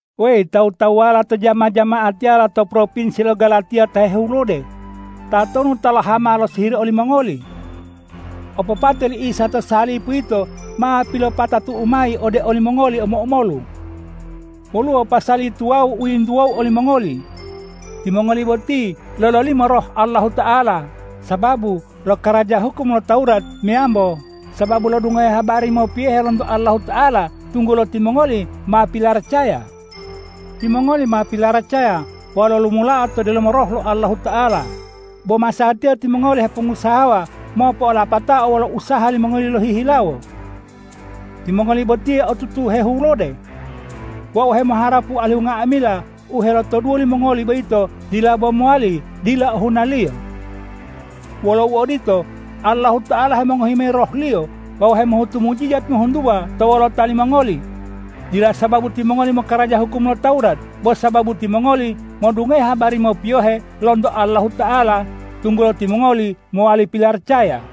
Weyi tawu-tawuwala to jama-jama'atiyala to propinsi lo Galatiya ta hehulode, tatonu ta lohama losihiri olimongoli? Opopate li Isa to salipu yito ma pilopopatatu'u mayi ode olimongoli omo-omolu. Woluwo pasali tuwawu u yintuwou olimongoli: Timongoli boti lololimo Roh Allahuta'ala sababu lokaraja hukum lo Tawurat meyambo sababu lodungohe habari mopiyohe lonto Allahuta'ala tunggulo timongoli ma pilaracaya? Timongoli ma pilaracaya wawu lolumulao to delomo Roh lo Allahuta'ala, bo masatiya timongoli hepongusahawa mopo'olapatao wolo usaha limongoli lohihilawo. Timongoli botiye otutu hehulode. Wau hemoharapu alihu nga'amila u helotoduwo limongoli boyito dila bo mowali dila ohunaliyo. Wolo uodito, Allahuta'ala hemongohi mayi Roh-Liyo wawu hemohutu mujijat ngohuntuwa to wolota limongoli, dila sababu timongoli mokaraja hukum lo Tawurat, bo sababu timongoli modungohe habari mopiyohe lonto Allahuta'ala, tunggulo timongoli mowali pilaracaya.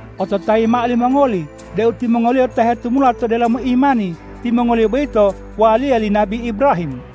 Ototayi mao limongoli deu timongoliyo ta hetumula to delomo imani, timongoliyo boyito waliya li nabi Ibrahim.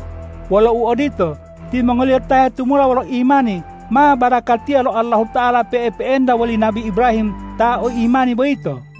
Wolo uodito, timongoliyo ta hetumula wolo imani ma barakatiya lo Allahuta'ala pe'epe'enta woli nabi Ibrahim ta o imani boyito.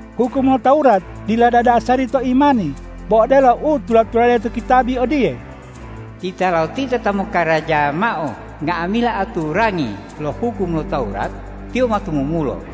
Hukum lo Tawurat, dila dadasari to imani; bo odelo u tula-tulade to kitabi odiye,”Titalotita ta mokaraja mao nga'amila aturangi lo hukum lo Tawurat, tiyo ma tumumulo.”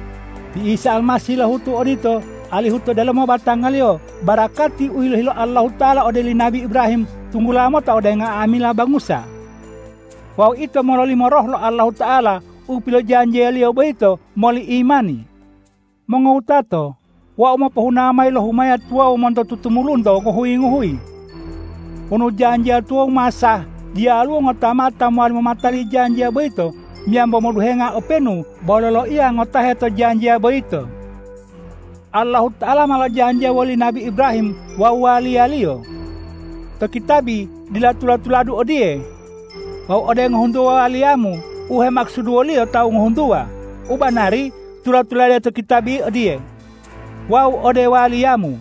Ti Isa Almasih lohutu odito alihu to delomo batanga-Liyo barakati u yilohi lo Allahuta'ala ode oli nabi Ibrahim tunggula mota ode nga'amila bangusa. Wawu ito mololimo Roh lo Allahuta'ala u pilojanjiya-Liyo boyito moli imani. Mongowutato, wau mopohuna mayi lo humaya tuwawu monto tutumulunto ngohuyi-ngohuyi. Wonu janjiya tuwawu ma sah, diyaluwo ngota mao ta mowali momatali janjiya boyito meyambo moduhenga openu bo loloiya ngotahe to janjiya boyito. Allahuta'ala ma lojanjiya woli nabi Ibrahim wawu waliyaliyo. To kitabi dila tula-tuladu odiye,”Wawu ode ngohuntuwa waliyamu,” u hemakusuduwoliyo tawu ngohuntuwa. U banari tula-tulade to kitabi odiye,”Wawu ode waliyamu.”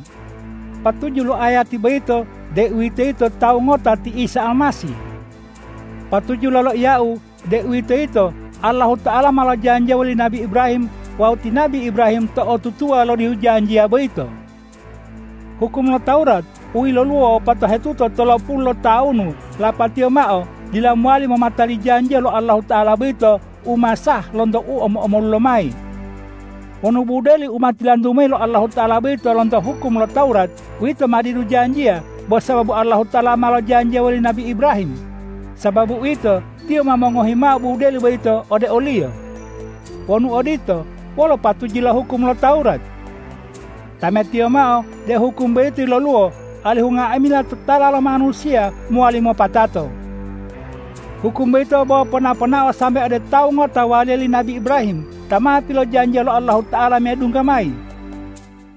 Patuju lo ayati boyito, deuwitoyito tawu ngota ti Isa Almasih. Patuju loloiyau, deuwitoyito Allahuta'ala ma lojanjiya woli nabi Ibrahim wawu ti nabi Ibrahim to'otutuwa lodihu janjiya boyito. Hukum lo Tawurat u yiloluwo wopato hetuta tolopulu lotawunu lapatiyo mao dila mowali momatali janjiya lo Allahuta'ala boyito u ma sah lonto u omo-omolu lomayi. Wonu budeli u ma tilantu mayi lo Allahuta'ala boyito lonto hukum lo Tawurat, uwito ma didu janjiya bo sababu Allahuta'ala ma lojanjiya woli nabi Ibrahim. Sababu uwito, Tiyo ma mongohi mao budeli boyito ode oliyo. Wonu odito, wolo patuju lo hukum lo Tawurat? Tametiyo mao deu hukum boyito yiloluwo alihu nga'amila totala lo manusiya mowali mopatato. Hukum boyito bo pona-ponao sambe ode Tawu ngota waliya li nabi Ibrahim, Ta ma pilojanjiya lo Allahuta'ala medungga mayi.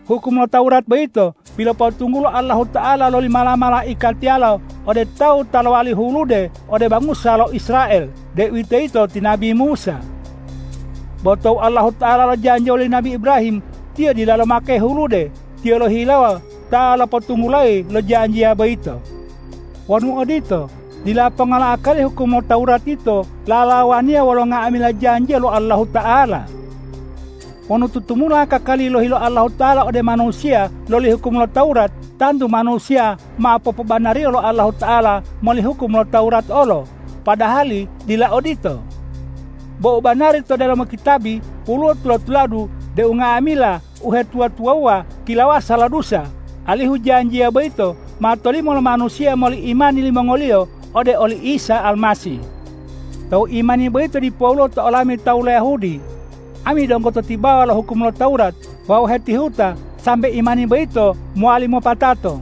Hukum lo Tawurat boyito pilopotunggulo Allahuta'ala loli mala-malaikatiyalo ode tawu ta lowali hulude ode bangusa lo Israel, deuwitoyito ti nabi Musa. Bo tou Allahuta'ala lojanjiya woli nabi Ibrahim, Tiyo dila lomake hulude. Tiyo lohihilawo ta lopotunggulayi lo janjiya boyito. Wonu odito, dila ponga lo akali hukum lo Tawurat yito lalawaniya wolo nga'amila janjiya lo Allahuta'ala. Wonu tutumula kakali yilohi lo Allahuta'ala ode manusiya loli hukum lo Tawurat, tantu manusiya ma popobanariyo lo Allahuta'ala moli hukum lo Tawurat olo, padahali dila odito. Bo u banari to delomo kitabi woluwo tula-tuladu deu nga'amila uhetuwa-tuwawuwa kilawasa lo dusa, alihu janjiya boyito ma tolimo lo manusiya moli imani limongoliyo ode oli Isa Almasih. Tou imani boyito dipoluwo to olami tawu lo Yahudi, ami donggo to tibawa lo hukum lo Tawurat wawu hetihuta sambe imani boyito mowali mopatato.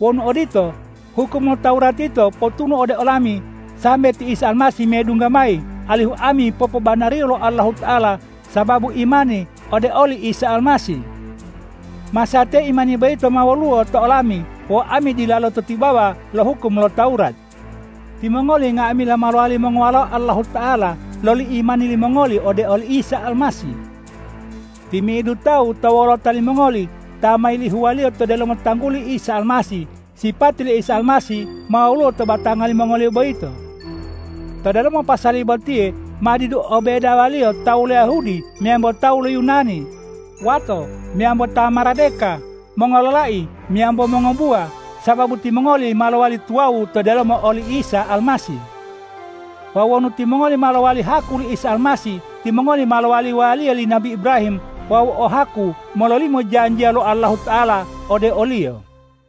Wonu odito, hukum lo Tawurat yito potunu ode olami sambe ti Isa Almasih medungga mayi, alihu ami popobanariyo lo Allahuta'ala sababu imani ode oli Isa Almasih. Masatiya imani boyito ma woluwo to olami wawu ami dilalo to tibawa lo hukum lo Tawurat. Timongoli nga'amila ma lowali mongowalao Allahuta'ala loli imani limongoli ode oli Isa Almasih. Timi'idu tawu to wolota limongoli ta ma yilihuwaliyo to delomo tangguli Isa Almasih, sipati li Isa Almasih ma woluwo to batanga limongoliyo boyito. To delomo pasali botiye ma didu o bedawaliyo tawu lo Yahudi meyambo tawu lo Yunani, wato meyambo ta maradeka, mongololai meyambo mongobuwa, sababu timongoli ma lowali tuwawu to delomo oli Isa Almasih. Wawu wonu timongoli ma lowali haku li Isa Almasih, timongoli ma lowali waliya li nabi Ibrahim wawu o haku mololimo janjiya lo Allahuta'ala ode oliyo.